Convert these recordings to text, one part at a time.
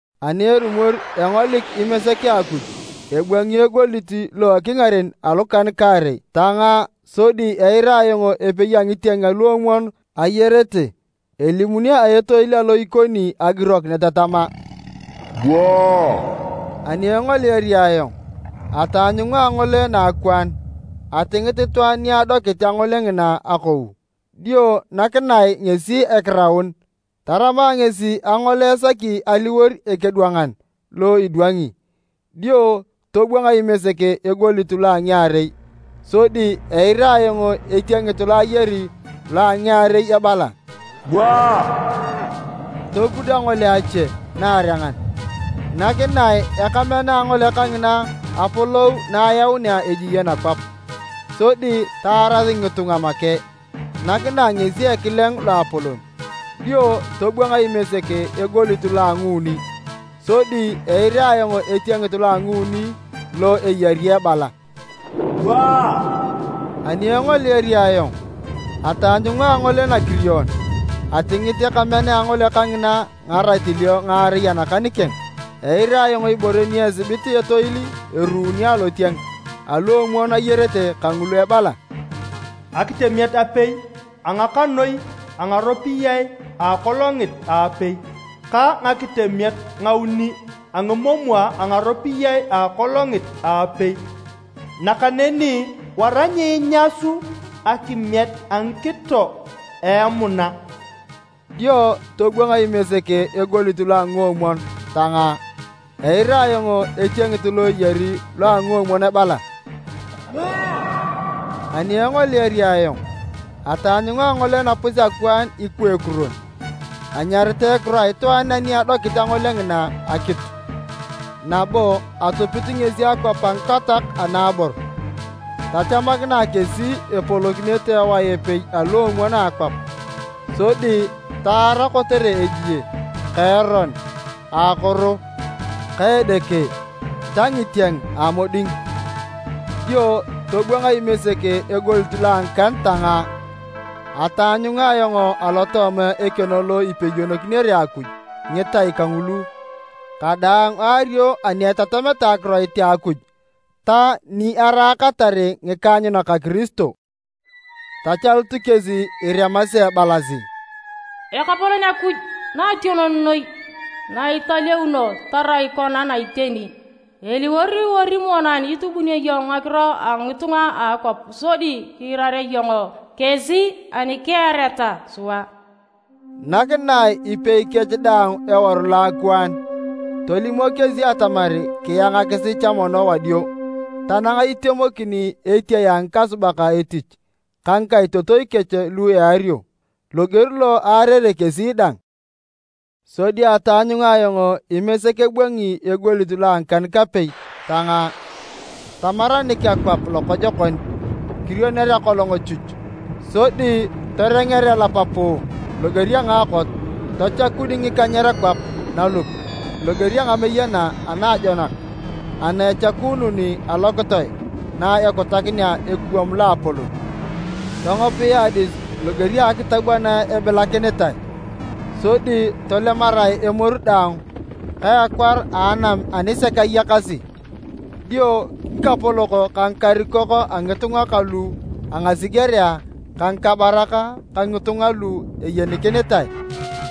Ani erumor engolik Imesek a Akuj ebwangi egoliet lo ekingaren alukan-kaarei tangaa, sodi eira ayong epei a ngitieng aluomwon ayarete elimuni a etoil alo ikoni agirokinet tama, “Bua!” Ani engoliari ayong, ataanyunga angole naakwaan. Atingit itwaan ni adokit angole ngina akau, dio nakinae ngesi ekiraun. Tarama ngesi angole esaki aliwor ekedwangan lo idwangi. Dio tobwang Imesek egoliet lo a ngiarei, sodi eira ayong etiengit lo ayari lo a ngiarei ebala, “Bua!” Topud angole ache naarengan. Nakinae ekamean a angole kangina apolou na ayaunea ejie nakwap, sodi taaras ngitunga make. Nakinae ngesi ekileng loapolon. Dio tobwang Imesek egoliet lo a nguuni, sodi eira ayong etiengit lo a nguuni lo eyari ebala, “Bua!” Ani engoliari ayong, ataanyunga angole nakirion. Atingit ekamean a angole kangina ngaratilio ngaarei anakan keng. Eira ayong ibore ni asibit etoil eruuni alotieng aluomwon ayarete kangulu ebala, “Akitemiet apei a ngakanoi a ngaropiyae a akolongit a apei, ka ngakitemiet ngauni a ngimomwa a ngaropiyae a akolongit a apei. Nakaneni wara nyiinyasu akimiet a a ngikito a emuna!” Dio tobwang Imesek egoliet lo a nguomwon tangaa, eira ayong etiengit lo eyari lo a nguomwon ebala, “Bua!” Ani engoliari ayong, ataanyunga angole napus-akwaan ikwa ekuron. Anyaritae ekiro a itwaan ani adokit angole ngina Akitu, nabo atupit ngesi Akwap a ngikatoak anaabor. Tachamakinae kesi epolokinete ewae epei aluomwon a akwap, sodi taara kotere ejie ka eron a akoro ka edeke ta ngitieng a moding. Dio tobwang Imesek egoliet lo a ngikan tangaa. Ataanyunga ayong alotooma ekeno lo ipeyonokinere Akuj ngitai kangulu kadaang aario ani etatameta akiroit a Akuj ta ni araakatar ngikaanyunak a Kiristo. Tachalut kesi iremasi ebalasi, “Ekapolon Akuj Noationon Noi, na italeuno tarai kon na iteni! Eliwor ori monan itubio iyong ngakiro a ngitunga a akwap sodi kirira iyong kesi ani kiareta sua?” Nakinae ipei kech daang eworu loakwaan, tolimok kesi atamar kiangasi cha mono wadio, tanang itemokin etiae a ngikasubak etich ka ngikaitotoi kech lu eario, loger lo aarere kesi dang. Sodi ataanyunga ayong Imesek ebwangi egoliet lo a ngikan-kapei tangaa. Tamaranik akwap lokojokon, kirioner akolong chuch, sodi torenger elap puu loger a ngaakot. Tachakun ngikanyer kwap nalup, loger a ngameyena anaajonak ana echakuunun alokitoe na ekutakinea ekuwam loapolon. Tongopia adis loger a akitab ana ebilakinitae, sodi tolemarae emoru daang ka ekwar a anam ani sek ayakasi. Dio ngikapolok ka ngikarikok a ngitunga ka lu a ngasigerea ka ngikabarak ka ngitunga lu eyenikinitae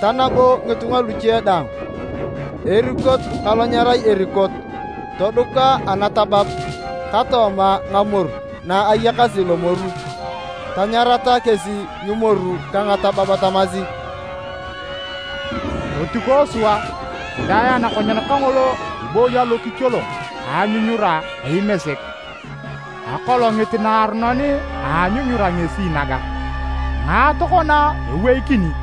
ta nabo ngitunga luche daang, erikot ka lo nyerai erikot, toduka anatabab ka tooma ngamoru na ayakasi lomoru. Tanyarata kesi ngimoru ka ngatabab tamasi, “Totikoe sua kidaa anakonyen kangolo ibooyi alokicholong ka anyunyura a Imesek! Akolongit naaronon a anyunyura ngesi naga, ngae tokona eweikini?”